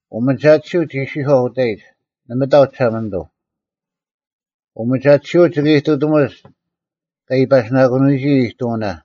ᐅᒥᒐᑎᓯᐤ ᒋ ᐃᔅᒋᔄᐤ ᐅᑕᐃᒡ, “ᓇᒪ ᑕᐤ ᒋᓴᒪᓂᑐᐤ᙮” ᐅᒥᒐᑎᓯᐅᒡ ᒋ ᐃᑐᑎᒧᒡ ᑲ ᐃᐸᓯᓇᒂᓂᔨᒋ ᐃᑐᐅᓇ,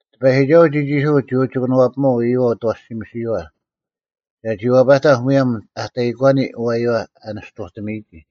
ᑎᐸᔨᒋᒐᓱᐤ ᒋᒋᒋᓯᑯᒡ ᒋ ᐅᒋ ᑭᓄᐛᐱᒥᒪᐤ ᐃᔪᐛ ᐅᑦ ᐊᐛᓯᒥᓱᐛᐛ, ᒐᒋ ᐛᐸᑕᐧᒃ ᒧᔭᒻ ᐊ ᑕᐃᒂᓂ ᐊᐛᔪᐛ ᐊ ᓂᔅᑐᑎᒥᔨᒋ,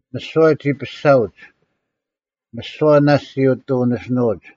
ᒥᓯᐛ ᒋ ᐱᔅᒐᐅᒡ; ᒥᓯᐛ ᓇᔅᒡ ᒋ ᐊᑎ ᐅᓂᓯᓄᐅᒡ: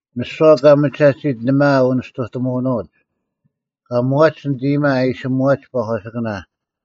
ᒥᓯᐛ ᑲ ᒥᒐᑎᓯᒡ ᓇᒪ ᐊ ᐅᓂᔅᑐᑎᒧᓄᐅᒡ? ᑲ ᒧᐛᒡ ᓂᑦ ᐃᔨᒪ ᐊ ᐃᓯ ᒧᐛᒡ ᐸᒂᓯᑭᓇ,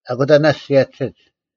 ᐊᑯᑕ ᓇᔅᒡ ᓯᔭᒋᓯᒡ: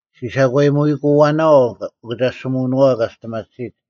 ᔅᒋ ᓴᒂᔨᒧᐃᑯᐛᓇᐛᐤ ᐅᑭᒐᔅᒋᒧᐛᐅᓄᐛᐤ ᑲ ᒋᔅᑎᒪᑎᓯᒡ,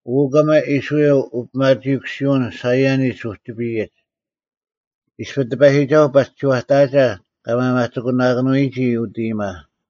ᐅ, ᑭᒪ ᐃᔅᕋᐃᓪ ᐅᐱᒪᒋᐃᑯᓯᐅᓐ ᓴᐃᔭᓂᒡ ᐅᒋᐱᔨᒡ! ᐃᔅᐱ ᑎᐸᔨᒋᒐᓱᐤ ᐸᒋ ᒋᐛᑕᐊᒐ ᑲ ᒪᒪᒋᑯᓇᑭᓄᐎᔨᒋ ᐅᑦ ᐃᔨᒪ,